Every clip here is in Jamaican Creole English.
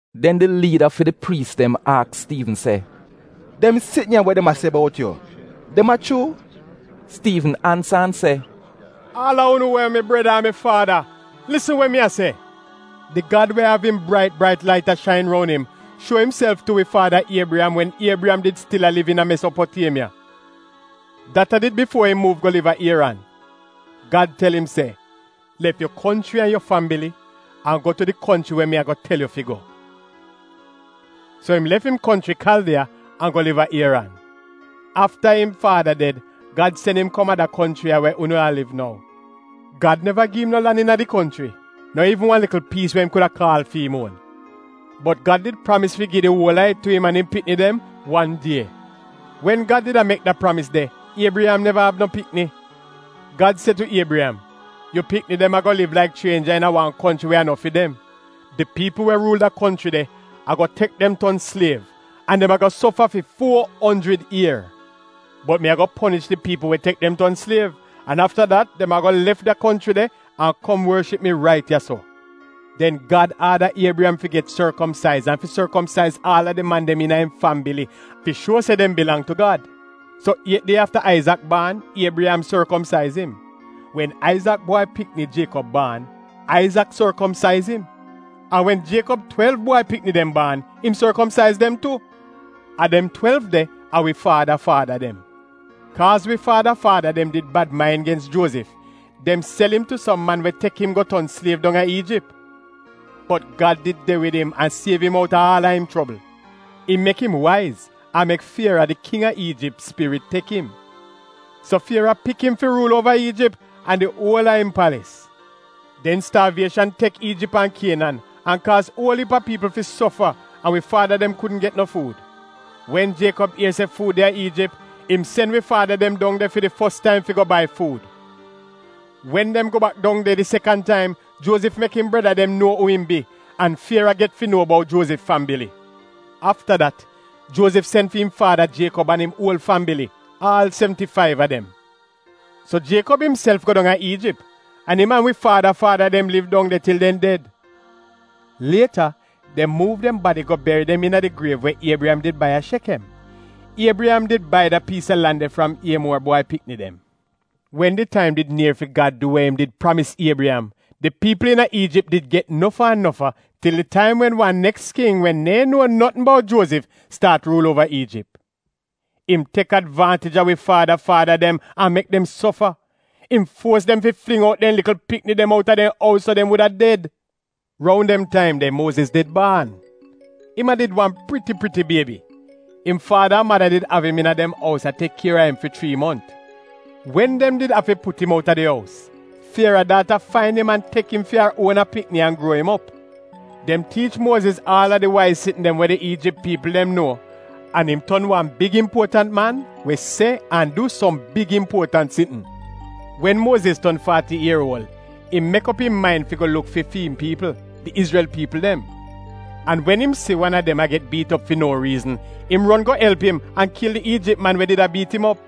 Den di liida fi di priis dem aks Stiivn se, “Dem sitn ya we dem a se bout yu, dem a chuu?” Stiivn ansa an se, “Aal a unu we a mi breda an mi faada, lisn we mi a se! Di Gad we av im brait brait lait a shain roun im, shuo imself tu wi faada Iebriyam wen Iebriyam did stil a liv iina Mesopotiemiya. Dat a did bifuo im muuv go liv a Ieran. Gad tel im se, ‘Lef yu konchri an yu fambili an go tu di konchri we mi ago tel yu fi go.’ “So im lef im konchri Kaldiya an go liv a Ieran. Afta im faada ded, Gad sen im kom a da konchri ya we unu a liv nou. Gad neva gi im no lan iina di konchri, no iivn wan likl piis we im kuda kaal fi'im. Bot Gad did pramis fi gi di uol a it tu im an im pikni dem wan die. Wen Gad did mek da pramis de Iebriyam neva av no pikni. Gad se tu Iebriyam, ‘Yu pikni dem ago liv laik chrienja iina wan konchri we a no fi dem. Di piipl we ruul da konchri de ago tek dem ton sliev an dem ago sofa fi fuo onjrid ier. Bot mi ago ponish di piipl we tek dem ton sliev, an afta dat dem ago lef da konchri de an kom worship mi rait ya-so.’ Den Gad aada Iebriyam fi get sorkomsaiz an fi sorkomsaiz aal a di man dem iina im fambili fi shuo se dem bilang tu Gad. So iet die afta Aizak did baan, Iebriyam sorkomsaiz im. Wen Aizak bwai pikni, Jiekob baan, Aizak sorkomsaiz im, an wen Jiekob twelv bwai pikini dem baan, im sorkomsaiz dem tu. A dem twelv de a wi faada faada dem. “Kaaz wi faada faada dem did bad main gens Juozif, dem sel im tu som man we tek im go ton sliev dong a Iijip. Bot Gad did de wid im an siev im outa aal a im chobl. Im mek im waiz an mek Fiera, di King a Iijip spirit tek im. So Fiera pik im fi ruul uova Iijip an di uol a im palis. “Den staavieshan tek Iijip an Kienan, an kaaz uol iip a piipl fi sofa, an wi faada dem kudn get no fuud. Wen Jiekob ier se fuud de a Iijip, im sen wi faada dem dong de fi di fos taim fi go bai fuud. Wen dem go bak dong de di sekan taim, Juozif mek im breda dem nuo uu im bi, an Fiera get fi nuo bout Juozif fambili. Afta dat, Juozif sen fi'im faada Jiekob an im uol fambili, aal sevnti-faiv a dem. So Jiekob imself go dong a Iijip, an im an wi faada faada dem liv dong de til dem ded. Lieta dem muuv dem badi go beri dem iina di griev we Iebriyam did bai a Shekem. Iebriyam did bai da piis a lan de fram Iemuor bwai pikini dem. “Wen di taim did nier fi Gad du wa im did pramis Iebriyam, di piipl iina Iijip did get nofa an nofa til di taim wen wan neks king we neehn nuo notn bout Juozif staat ruul uova Iijip. Im tek advaantij a wi faada faada dem an mek dem sofa. Im fuos dem fi fling out dem likl pikni dem outa dem ous so dem wuda ded. “Roun dem taim de Muoziz did baan. Im a did wan priti-priti biebi. Im faada an mada did av im iina dem ous a tek kier a im fi chrii mont. Wen dem did afi put im outa di ous, Fiera daata fain im an tek im fi ar uona pikni an gruo im op. Dem tiich Muoziz aal a di waiz sitn dem we di Iijip piipl dem nuo an im ton wan big impuotant man we se an du som big impuotant sitn. Wen Muoziz ton faati ier uol, im mek op im main fi go luk fi fi'im piipl, di Izrel piipl dem. An wen im si wan a dem a get biit op fi no riizn im ron go elp im an kil di Iijip man we did a biit im op.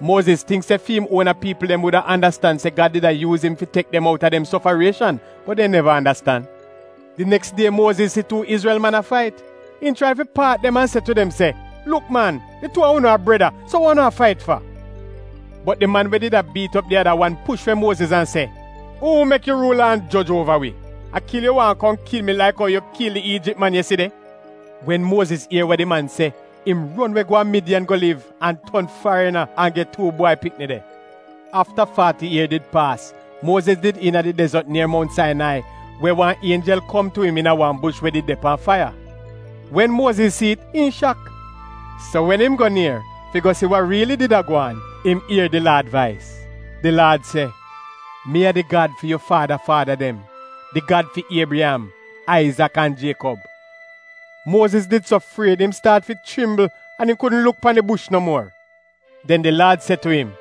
Muoziz tingk se fi'im uona piipl wuda andastan se Gad did a yuuz im fi tek dem outa dem sofarieshan, bot dem neva andastan. Di neks die Muoziz si tuu Izrel man a fait. Im chrai fi paat dem an se tu dem, ‘Luk man, di tuu a unu a breda, so wa unu a fait fa?’ “Bot di man we did a biit op di ada wan push we Muoziz an se, ‘Uu mek yu ruula an joj uova wi? A kil yu waahn kom kil mi laik ou yu kil di Iijip man yeside?’ Wen Muoziz ier wa di man se, im ron we go a Midiyan go liv an ton farina an get tuu bwai pikni de. “Afta faati ier did paas, Muoziz did iina di dezot nier mount Sainai we wan ienjel kom tu im iina wan bush we did de pan faiya. Wen Muoziz si'it im shak. So wen im go nier fi go si wa riili did a gwaan im ier di Laad vais. Di Laad se, ‘Mi a di Gad fi yu faada faada dem, di Gad fi Iebriyam, Aizak an Jiekob.’ Muoziz did so fried im staat fi chrimbl an im kudn luk pan di bush no muor. “Den di Laad se tu im,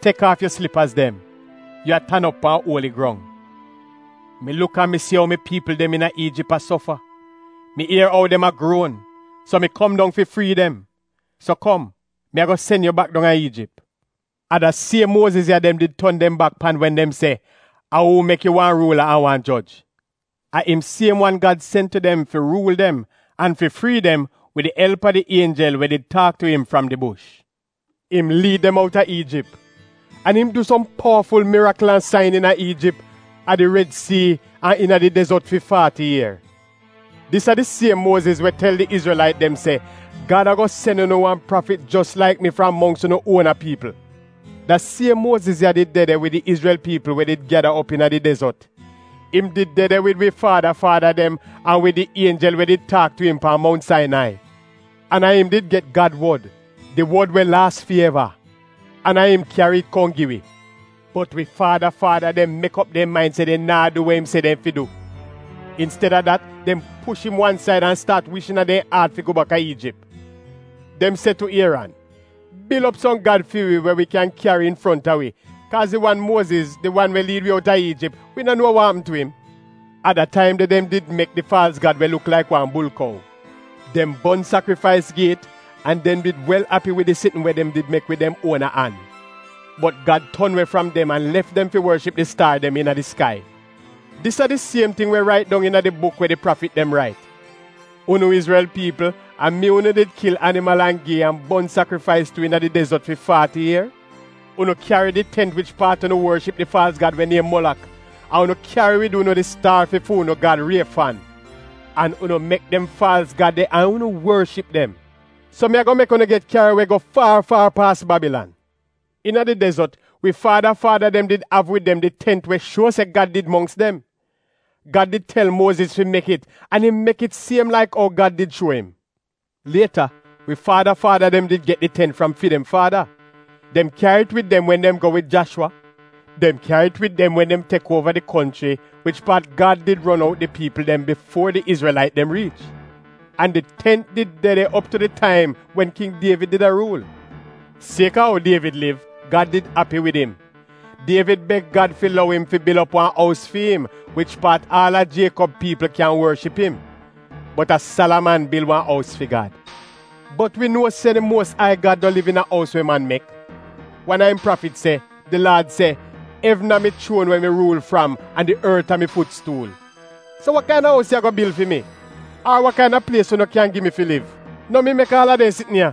‘Tek aaf yu slipaz dem; yu a tan op pan uoli grong. Mi luk an mi si ou mi piipl dem iina Iijip a sofa. Mi ier ou dem a gruon, so mi kom dong fi frii dem. So kom, mi ago sen yu bak dong a Iijip.’ “A da siem Muoziz ya dem did ton dem bak pan wen dem se, ‘A uu mek yu wan ruula an wan joj? ’ A im siem wan Gad sen tu dem fi ruul dem an fi frii dem wid di elp a di ienjel we did taak tu im fram di bush. Im liid dem outa Iijip. An im du som powaful mirikl an sain iina Iijip, a di Red Sii an iina di dezot fi faati ier. “Dis a di siem Muoziz we tel di Izrelait dem se, ‘Gad ago sen unu wan prafit jos laik mi fram mongks unu uona piipl.’ Da siem Muoziz ya did de de wid di Izrel piipl we did gyada op iina di dezot. Im did de de wid wi faada faada dem an wid di ienjel we did taak tu im pan Mount Sainai. An a im did get Gad wod, di Wod we laas fi eva, an a im kyari it kom gi wi. “Bot wi faada faada dem mek op dem main se dem naa du wa im se dem fi du. Insteda dat, dem push im wan said an staat wish iina dem aat fi go baka Iijip. Dem se tu Ieran, ‘Bil op som gad fi wi we wi kyan kyari infronta wi, kaaz di wan Muoziz, di wan we liid wi outa Iijip, wi no nuo wa apm tu im!’ A da taim de dem did mek di faalz gad we luk laik wan bulkou. Dem bon sakrifais gi it, an dem did wel api wid di sitn wa dem mek wid dem uona an. Bot Gad ton we fram dem an lef dem fi worship di staar dem iina di skai. Dis a di siem ting wa rait dong iina di buk we di prafit dem rait: ‘Unu Izrel piipl a mi unu did kil animal an gi an bon sakrifais tu iina di dezot fi faati ier? Unu kyari di tent wich paat unu worship di faalz gad we niem Molak an unu kyari wid unu di staar fi fu'unu gad Riefan. An unu mek dem faalz gad de an unu worship dem. So mi ago mek unu get kyari we go faar faar paas Babilan.’ Iina di dezot wi faada faada dem did av wid dem di tent we shuo se Gad did de mongks dem. Gad did tel Muoziz fi mek it an im mek it siem laik ou Gad did shuo im. Lieta wi faada faada dem get did tent fram fi dem faada. Dem kyari it wid dem wen dem go wid Jashwa. Dem kyari it wid dem wen dem tek uova di konchri wich paat Gad did ron out di piipl dem bifuo di Izrelait dem riich. An di tent did de op tu di taim wen king Dievid did a ruul. Sieka ou Dievid liv, Gad did api wid im. Dievid beg Gad fi lou im fi bil op wan ous fi'im, wich paat aal a Jiekob piipl kyan worship im. Bot a Salaman bil wan ous fi Gad. Bot wi nuo se di Muos Ai Gad no onggl liv iina ous we man mek. Wan a im prafit se: “Di Laad se, ‘Evn a mi chuon we mi ruul fram an di ort a mi fut stuul. So wa kaina ous yu ago bil fi mi? Ar wa kaina plies unu kyan gi mi fi liv? No mi mek aal a dem sitn ya?’”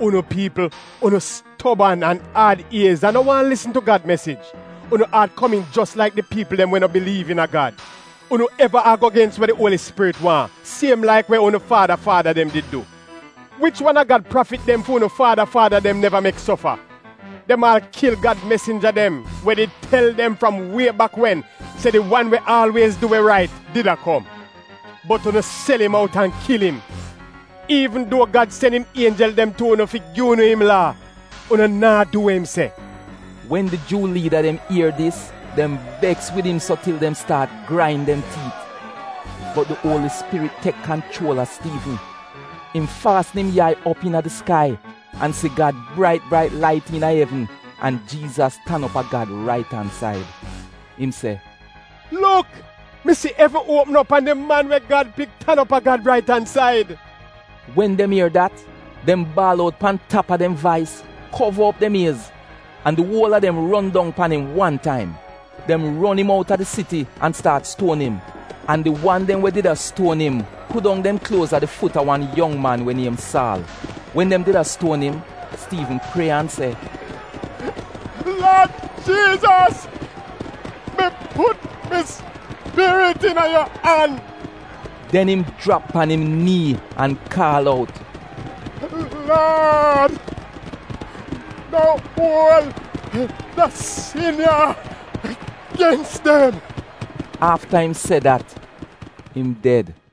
“Unu piipl, unu stoban, an aad iez an no waahn lisn tu Gad mesij. Unu aat komiin jos laik di piipl dem we no biliiv iina Gad. Unu eva ago gens wa di Uoli Spirit waahn, siem laik we unu faada faada dem did du! Wich wan a Gad prafit dem fi unu faada faada dem neva mek sofa? Dem aal kil Gad mesinja dem we did tel dem fram wie bak wen se di wan we aalwiez du we rait did a kom. Bot unu sel im out an kil im. Iivn duo Gad sen im ienjel dem tu unu fi gi unu im Laa, unu naa du we im se.” Wen di Juu liida dem ier dis dem beks wid im so til dem staat grain dem tiit. Bot di Uoli Spirit tek kanchuol a Stiivn. Im faasn im yai op iina di skai an si Gad brait brait lait iina evn an Jiizas tan op a Gad rait an said. Im se “Luk! Mi si evn uopm op an di Man we Gad pik tan op a Gad rait an said.” Wen dem ier dat, dem baal out pan tap a dem vais, kova op dem iez, an di uol a dem ron dong pan im wan taim. Dem ron im out a di siti an staat stuon im. An di wan dem we did a stuon im pudong dem kluoz a di fut a wan yong man we niem Saal. Wen dem did a stuon im, Stiivn prie an se, “Laad Jiizas, mi put mi spirit iina yu an.” Den im jrap pan im nii an kaal out, “Laad, no uol da sin ya gens dem.” Afta im se dat im ded.